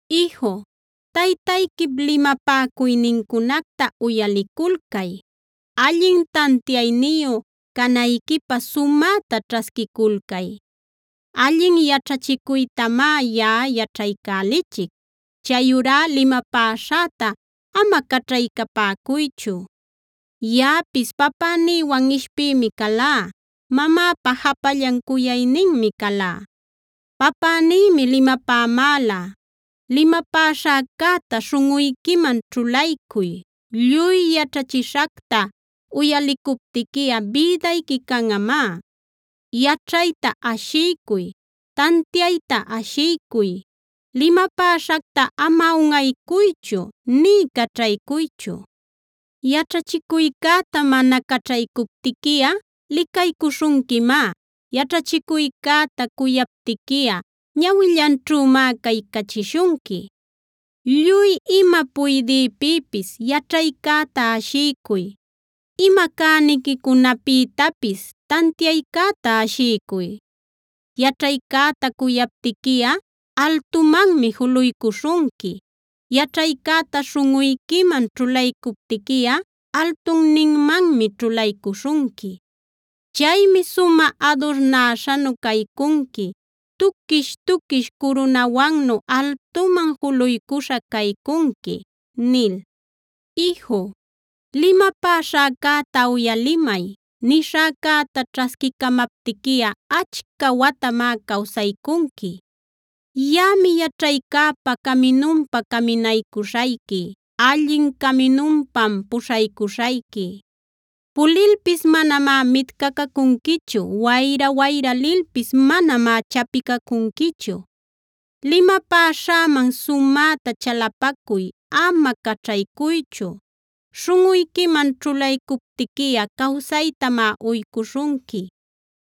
Iju, taytayquip limapäcuynincunacta uyaliculcay; allin tantiayniyu canayquipä sumäta ćhasquiculcay. Allin yaćhachicuytamá yaꞌa yaćhaycälichic; chayurá limapäśhäta ama caćhaycapäcuychu. Yaꞌapis papänïwan ishpïmi calá; mamäpa japallan cuyayninmi calá. Papänïmi limapämäla: “Limapäśhäcäta śhunꞌuyquiman ćhulaycuy; lluy yaćhachishacta uyalicuptiquiꞌa bïdayqui canꞌamá. Yaćhayta ashiycuy, tantiayta ashiycuy; limapäśhacta ama unꞌaycuychu nï caćhaycuychu. Yaćhachicuycäta mana caćhaycuptiquiꞌa licaycuśhunquimá; yaćhachicuycäta cuyaptiquiꞌa ñawillanćhümá caycachishunqui. Lluy ima puydïpïpis, ¡yaćhaycäta ashiycuy! Ima cäniquicunapïtapis, ¡tantiaycäta ashiycuy! Yaćhaycäta cuyaptiquiꞌa altumanmi juluycuśhunqui; yaćhaycäta śhunꞌuyquiman ćhulaycuptiquiꞌa altunninmanmi ćhulaycuśhunqui. Chaymi sumä adurnäśhanu caycunqui; tuquish-tuquish curunawannu altuman juluycuśha caycunqui” nil. Iju, limapäśhäcäta uyalimay; nishäcäta ćhasquicamaptiquiꞌa achca watamá cawsaycunqui. Yaꞌami yaćhaycäpa caminunpa caminaycuśhayqui; allin caminunpam puśhaycuśhayqui. Pulilpis manamá mitcacacunquichu; wayra-wayra lilpis manamá chapicacunquichu. Limapäśhäman sumäta chalapacuy, ama caćhaycuychu; śhunꞌuyquiman ćhulaycuptiquiꞌa cawsaytamá uycuśhunqui.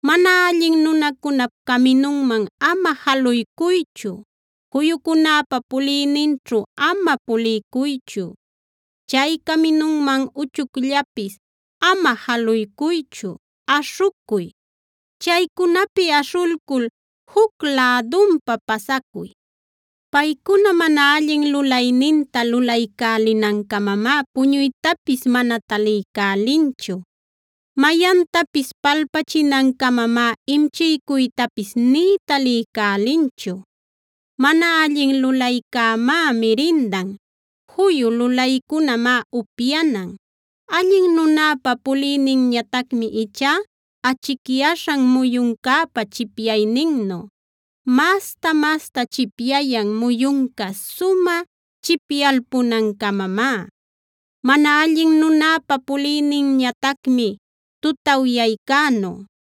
Mana allin nunacunap caminunman ama jaluycuychu; juyucunäpa puliyninćhu ama puliycuychu. Chay caminunman uchucllapis ama jaluycuychu; aśhucuy. Chaycunapi aśhulcul juc lädunpa pasacuy. Paycuna mana allin lulayninta lulaycälinancamamá puñuytapis mana taliycälinchu; mayantapis palpachinancamamá imchiycuytapis nï taliycälinchu. Mana allin lulaycämá mirindan; juyu lulaycunämá upyanan. Allin nunäpa puliyninñatacmi ichá achicyaśhan muyuncäpa chipyayninnu; masta-masta chipyayan muyunca sumä chipyalpunancamamá. Mana allin nunäpa puliyninñatacmi tutawyaycänu;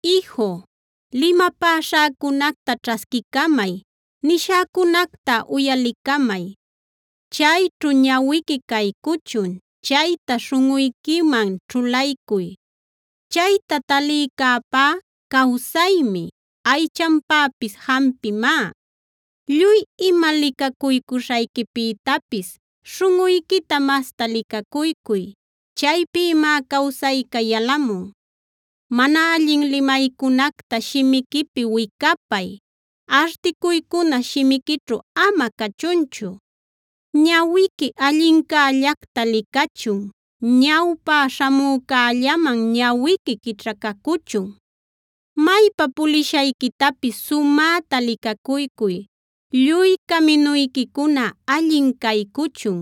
Iju, limapäśhäcunacta ćhasquicamay; nishäcunacta uyalicamay. Chayćhu ñawiqui caycuchun; chayta śhunꞌuyquiman ćhulaycuy. Chayta talïcäpá cawsaymi, aychanpäpis jampimá. Lluy ima licacuycuśhayquipïtapis śhunꞌuyquita masta licacuycuy; chaypïmá cawsayca yalamun. Mana allin limaycunacta shimiquipi wicapay; articuycuna shimiquićhu ama cachunchu. Ñawiqui allincällacta licachun; ñawpä śhamücällaman ñawiqui quićhacacuchun. Maypa pulishayquitapis sumäta licacuycuy; lluy caminuyquicuna allin caycuchun.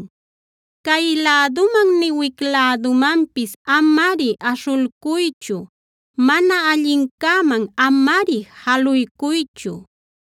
Cay läduman nï wic lädumanpis amari aśhulcuychu; mana allincäman amari jaluycuychu.